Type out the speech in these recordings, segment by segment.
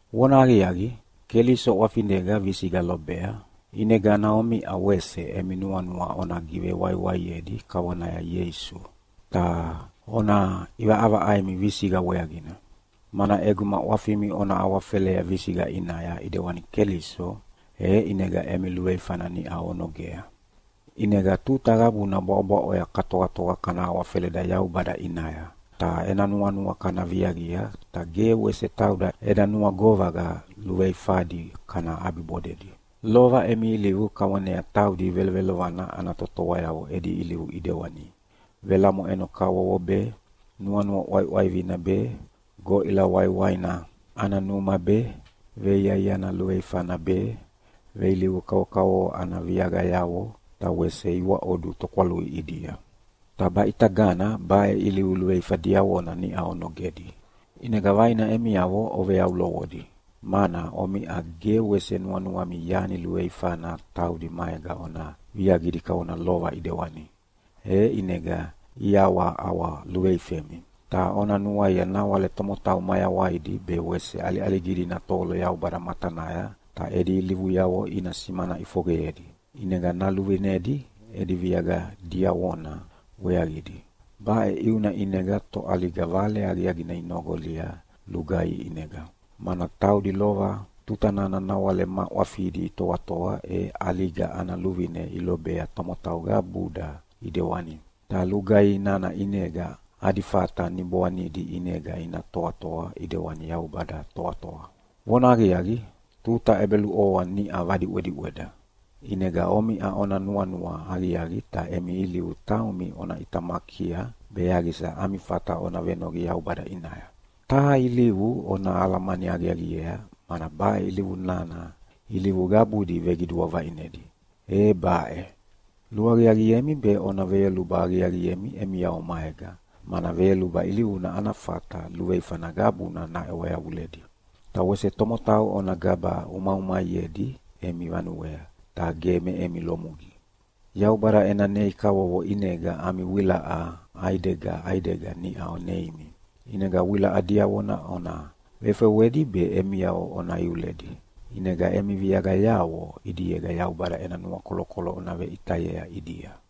Vonahaqiaqi, Keliso ʼwafinega visiqa lobea, ʼinegana omiʼa wese emi nuanua ona givewaiwaiedi kavonaya Ieisu, ta ona ʼivaʼavaʼaimi visiqa weaqina. Mana ʼeguma ʼwafimi ona awafelea visiqa ʼinaya ʼidewana Keliso, e ʼinega emi luveifana niʼau onogea. ʼInega tuta qabuna bwaʼobwaʼoya katoatoa kana awafeleda Yaubada ʼinaya, ta ena nuanua kana viaqia ta ge wese tauda eda nuagovaqa luveifadi kana ʼabibodedi. Lova emi ilivu kavonea taudi velovelovana ana totoayavo edi ilivu ʼidewani velamoʼeno kavokavovo be, nuanua ʼwaiʼwaivina be, goʼila waiwaina ana numa be, veiaiana luveifana be, veilivu kavokavovo ana viaqayavo, ta wese iwaʼodu tokwalui ʼidia. Ta baʼitagana baʼe ilivu luveifa diavona niʼau onogedi, ʼinega vaina emiavo oveyaulovodi, mana omiʼa ge wese nuanuami yani luveifana taudi maega ona viaqidi kavona lova ʼidewani, e ʼinega iʼawaʼawa luveifemi. Ta ona nuaia nawale tomotau mayawaidi be wese ʼaliʼaligidi ina tovolo Yaubada matanaya ta edi ilivuyavo ina simana ʼifoqeyedi, ʼinega naluvinedi edi viaqa diavona weaqidi. Baʼe ʼiuna ʼinega toʼaliga Vale Aqiaqina inoqolia lugaihi ʼinega. Mana taudi lova tuta nana nawale ma ʼwafidi itoatoa e ʼaliga ana luvine ilobea tomotau qabuda ʼidewani. Ta lugaihi nana ʼinega adi fata niboanidi ʼinega ina toatoa ʼidewani Yaubada toatoa. Vonahaqiaqi, tuta ʼebeluʼovoa niʼa vadiʼwediʼweda, ʼinega omiʼa ona nuanua aqiaqi ta emi ilivu taumi ona ʼitamakia be yaqisa ami fata ona venoqi Yaubada ʼinaya. Taha ilivu ona alamani aqiaqiea mana baʼe ilivu nana ilivu qabudi veqidua vaʼinedi, e baʼe: Luaqiaqiemi be ona veyoluba aqiaqiemi emiavo maega, mana veyoluba ilivuna ana fata luveifana qabuna naʼewa yavuledi. Ta wese tomotau ona gaba ʼumaʼumaiedi emi vanuea, ta ge me emi lumugi. Yaubada ena nei kavovo ʼinega ami wilaʼa ʼaidega ʼaidega niʼa neimi, ʼinega wilaʼa diavona ona vefewedi be emiavo ona iuledi, ʼinega emi viaqayavo ʼidiega Yaubada ena nuakolokolo ona veʼitayea ʼidia.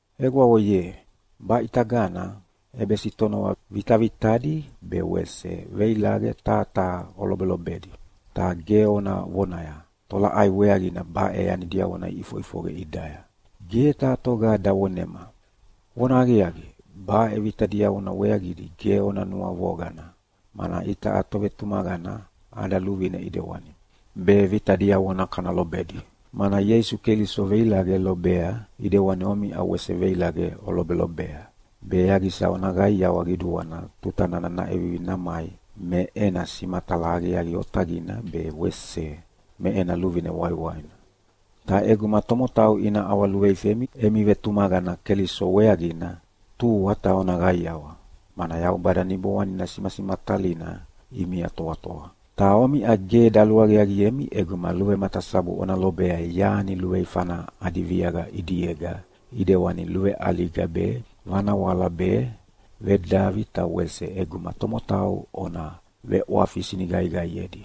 Egwavo ye, baʼitagana ʼebesitonova vitavitadi be wese veilaqe taha taha olobelobedi. Ta ge ona vonaya, “Tolaʼai weaqina baʼe yani diavona iʼifoʼifoqe ʼidaya? Ge taha toga davonema!” Vonahaqiaqi, baʼe vita diavona weaqidi ge ona nuavoqana, mana itaʼa tovetumaqana ada luvine ʼidewani, be vita diavona kana lobedi. Mana Ieisu Keliso veilaqe lobea ʼidewani omiʼa wese veilaqe olobelobea, be yaqisa ona qaiawa qiduana tuta nana naʼevivi namai me ena simatala aqiaqi otaqina be wese me ena luvine waiwaina. Ta ʼeguma tomotau ina ʼawaluveifemi emi vetumaqana Keliso weaqina, tua ta ona qaiawa, mana Yaubada Niboanina simasimatalina ʼimia toatoa. Ta omiʼa ge daluaqiaqiemi ʼeguma luvematasabu ona lobea yani luveifana adi viaqa ʼidiega ʼidewana luveʼaliga be, vanawala be, vedavi ta wese ʼeguma tomotau ona veʼwafi siniqaiqaiedi.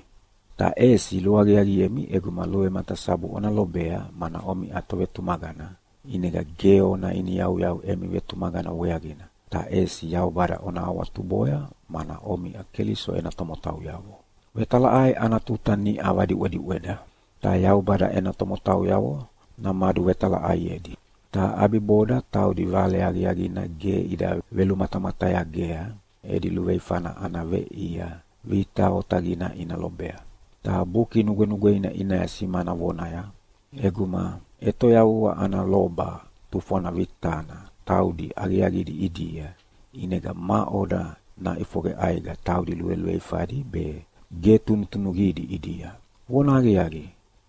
Ta ʼesi luaqiaqiemi ʼeguma luvematasabu ona lobea mana omiʼa tovetumaqana, ʼinega ge ona iniyauyau emi vetumaqana weaqina, ta ʼesi Yaubada ona awatuboya mana omiʼa Keliso ena tomotauyavo. Vetalaʼai ana tuta niʼa vadiʼwediʼweda, ta Yaubada ena tomotauyavo namaduvetalaʼaiedi. Ta ʼabiboda taudi Vale Aqiaqina ge ida velumatamatayagea edi luveifana ana veʼia vita otaqina ina lobea. Ta Buki Nugwenugweina ʼinaya simana vonaya, “ʼEguma ʼetoyavua ana loba tufwana vitana taudi aqiaqidi ʼidia, ʼinega maʼoda naʼifoqe ʼaiqa taudi luveluveifadi be ge tunutunuqidi ʼidia? Vonahaqiaqi,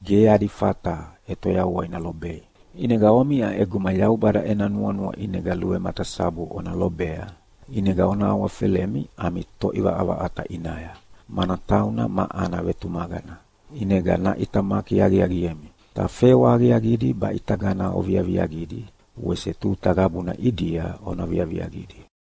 ge adi fata ʼetoyavua ina lobei.” ʼInega omiʼa ʼeguma Yaubada ena nuanua ʼinega luvematasabu ona lobea, ʼinega ona awafelemi ami Toʼivaʼavaʼata ʼinaya, mana tauna ma ana vetumaqana, ʼinega naʼitamaki aqiaqiemi. Ta fewa aqiaqidi baʼitagana oviaviaqidi wese tuta qabuna ʼidia ona viaviaqidi.